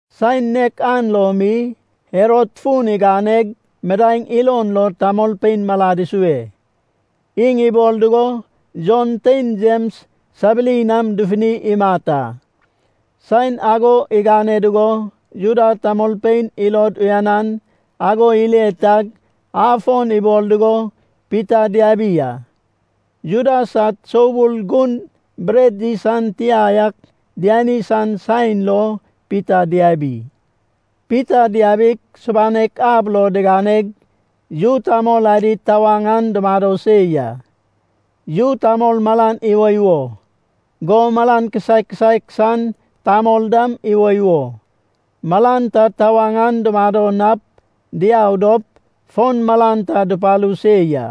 Saen nek an lo mi Herod fun iganeg midaeŋ ilon lo tamolpein malad isue. Iŋ ibol dugo Jon tein Jems sabiri nam dufuni imat a. Saen ago igane dugo Juda tamolpein ilod uyanan ago ile tag, afon ibol dugo Pita diabi a. (Juda sad soubul gun bret yis an tia ak diani san saen lo Pita diabi.) Pita diabig, subanek ab lo diganeg, yu tamol adi tawaŋ an dumado se ya. Yu tamol malan iwoiwo, go malan kisaek kisaek san tamol dam iwoiwo. Malan ta tawaŋ an dumado nap, diau dop, fon malan ta dupalu se ya.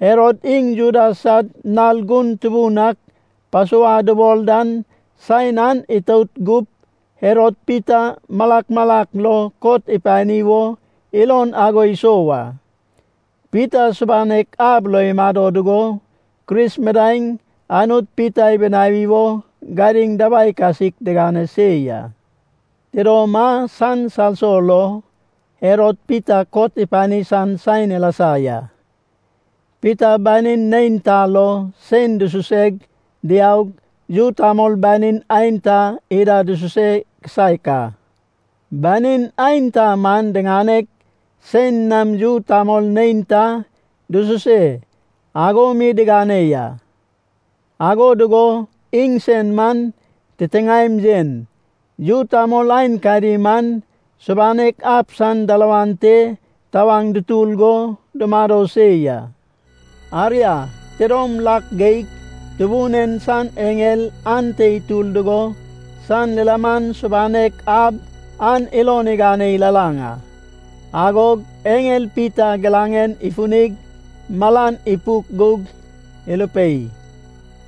Herod iŋ Juda sad nal gun tubun ak Pasova dubol dan saen an itout gup, Herod Pita malak malak lo kot ipani wo ilon ago isou a. Pita subanek ab lo imado dugo, Kris midaeŋ Anut Pita ibinawi wo gadiŋ dabai kasik digane se ya. Tidom a san salso lo Herod Pita kot ipani san saen ilasa ya. Pita banin neinta lo sein dususeg diaug, yu tamol banin aenta ida dususe kisaek a. Banin aenta man diŋaneg sein nam yu tamol neinta dususe ago mi digane ya. Ago dugo iŋsen man titiŋaem yen. Yu tamol aenkadi man subanek ab san dalawan te tawaŋ dutur go dumado se ya. Aria tidom lak geig Tubun en san eŋel ante itur dugo, san lilaman subanek ab an ilon igane ilalaŋ a. Agog eŋel Pita giraŋen ifunig malan ipuk gug irupei,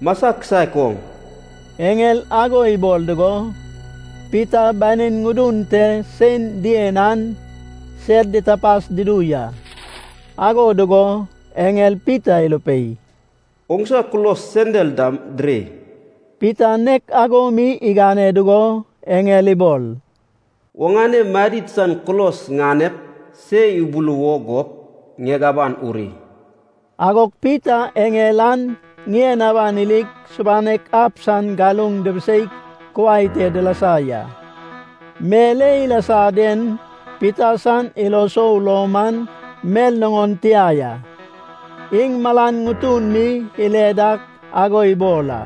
“Masa kisaek oŋ!” Eŋel ago ibol dugo, Pita banin ŋudun te sein dien an sed ditapas dudu ya. Ago dugo eŋel Pita irupei, “Oŋsa kulos sendal dam diri.” Pita nek ago mi igane dugo eŋel ibol, “Oŋane madid san kulos ŋanep se ibuluwo gup, ŋieg aban uri.” Agog Pita eŋel an ŋien aban irig subanek ab san galuŋ dibiseig kuai te dilasa ya. Mel e ilasa den Pita san ilo sou lo man mel nuŋon tia ya, iŋ malan ŋutun mi ile dak ago ibol a.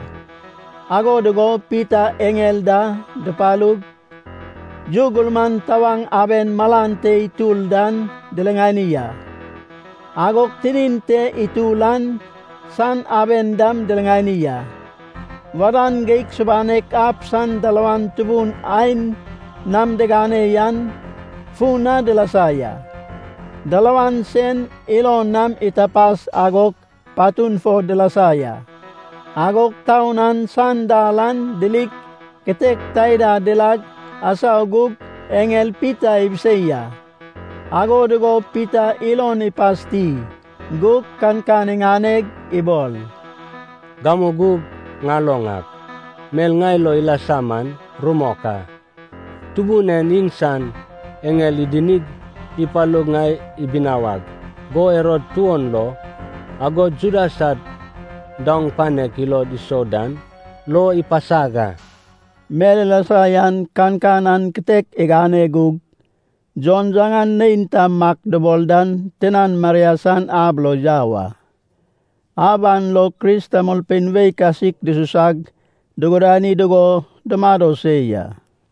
Ago dugo Pita eŋel da dupalug, yu gurman tawaŋ aben malan te itur dan diriŋani a. Agog tinin te itur an san aben dam diriŋani a. Wadan geig subanek ab san dalawan tubun ain nam digane yan fun na dilasa ya. Dalawan sen ilon nam itapas, agog patun fo dilasa ya. Agog taun an san dal an dirig kitek taida dilag asau gug eŋel Pita ibisei a. Ago dugo Pita ilon ipasti gug kankan iŋaneg ibol. “Gamu gug ŋaloŋ ak, mel ŋai lo ilasa man rumok a. Tubun en iŋsan eŋel idinig, ipalug ŋai ibinawag go Herod tuon lo, agod Juda sad daoŋ panek ilod isou dan lo ipasag a.” Mel ilasa yan kankan an kitek igane gug, Jon yaŋan neinta Mak dubol dan tinan Maria san ab lo yau a. Ab an lo Kris tamolpein wei kasik dususag dugudani dugo dumado se ya.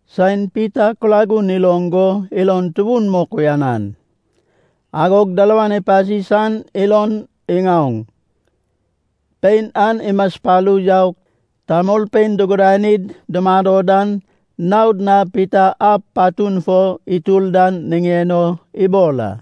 Saen Pita kulagun iloŋ go ilon tubun mok uyanan. Agog dalawan ipasi san ilon iŋaoŋ. Pein an imaspalu yaug, tamolpein dugudanid dumado dan naod na Pita ab patun fo itur dan niŋen o ibol a.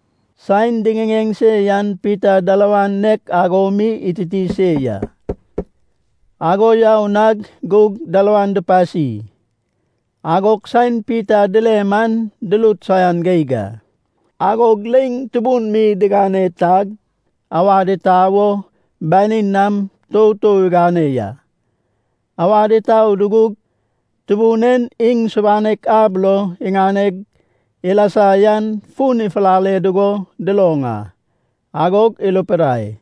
Saen diŋiŋeŋ se yan Pita dalawan nek ago mi ititi se ya. Ago yau na gug dalawan dupasi. Agog saen Pita dile man durut saian geig a. Agog leiŋ tubun mi digane tag, awad itau wo banin nam toutou igane ya. Awad itau dugug, Tubun en iŋ subanek ab lo iŋaneg ilasa yan fun ifulale dugo duloŋ a. Agog irupidai,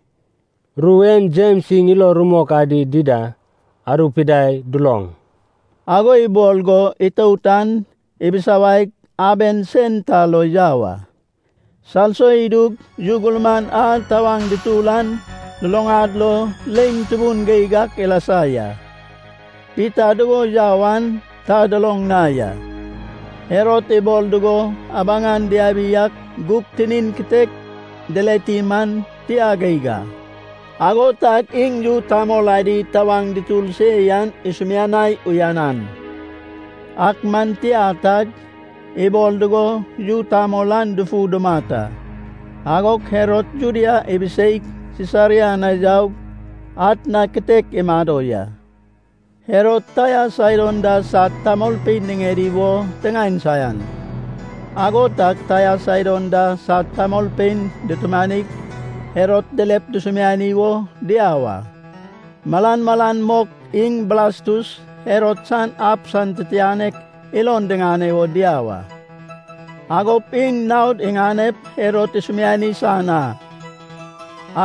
“Ru en Jems iŋ ilo rumok adi dida arupidai duloŋ.” Ago ibol go itout an ibisawaig, aben sen ta lo yau a. Salso idug yu gurman a tawaŋ dutur an luluŋad lo leiŋ tubun geig ak ilasa ya. Pita dugo yau an ta duloŋ na ya. Herod ibol dugo abaŋan diabi ak gug tinin kitek dileti man tia geig a. Ago tag iŋ yu tamol adi tawaŋ dutur se yan isumianai uyanan. Ak man tia tag, ibol dugo yu tamol an dufu dumat a. Agog Herod Judea ibiseig, Sisaria na yaug, atna kitek imado ya. Herod Taia Saidon da sad tamolpein niŋedi wo tiŋaen saian. Ago tag Taia Saidon da sad tamolpein dutumanig Herod dilep dusumiani wo diau a. Malan malan mok iŋ Blastus, Herod san ab san titianek, ilon diŋane wo diau a. Agop iŋ naod iŋanep Herod isumiani san a.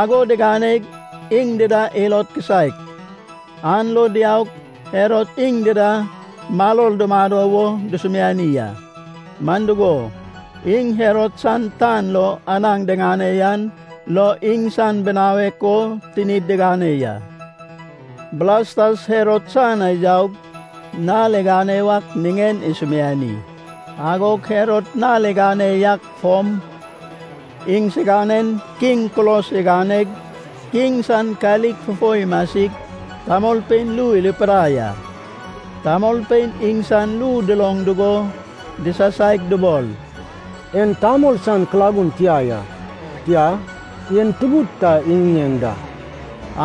Ago diganeg, iŋ dida ilod kisaek. An lo diaug, Herod iŋ dida maror dumado wo dusumiani a. Man dugo, iŋ Herod san tan lo anaŋ diŋane yan lo iŋsan binawek o tinid digane ya. Blastas Herod san na yaug, nal igane wak niŋen isumiani. Agog Herod nal igane yak fom iŋsiganen kiŋ kulos iganeg, kiŋ san kalik fufo imasig, tamolpein ru irupidai a. Tamolpein iŋsan ru duloŋ dugo disasaig dubol, “En tamol san kulagun tia ya. Tia, en tubud ta iŋiŋeŋ da.”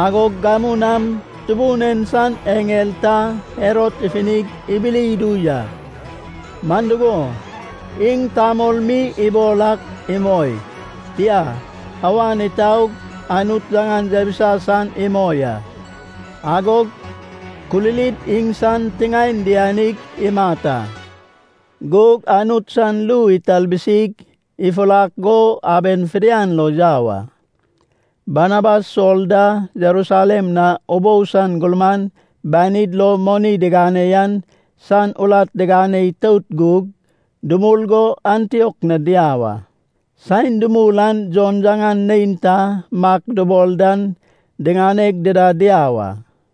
Agog gamu nam Tubun en san eŋel ta Herod ifunig ibili idu ya. Man dugo, iŋ tamol mi ibol ak imoi. Tia, awan itaug Anut yaŋan yabisa san imoi a. Agog kulilid iŋsan tiŋaen dianig imat a. Gug Anut san ru italbisig, ifurak go aben fidian lo yau a. Barnabas Sol da Jerusalem na ubou san gurman banid lo moni digane yan san urat digane itout gug, dumul go Antiok na diau a. Saen dumul an Jon yaŋan neinta Mak dubol dan diŋaneg dida diau a.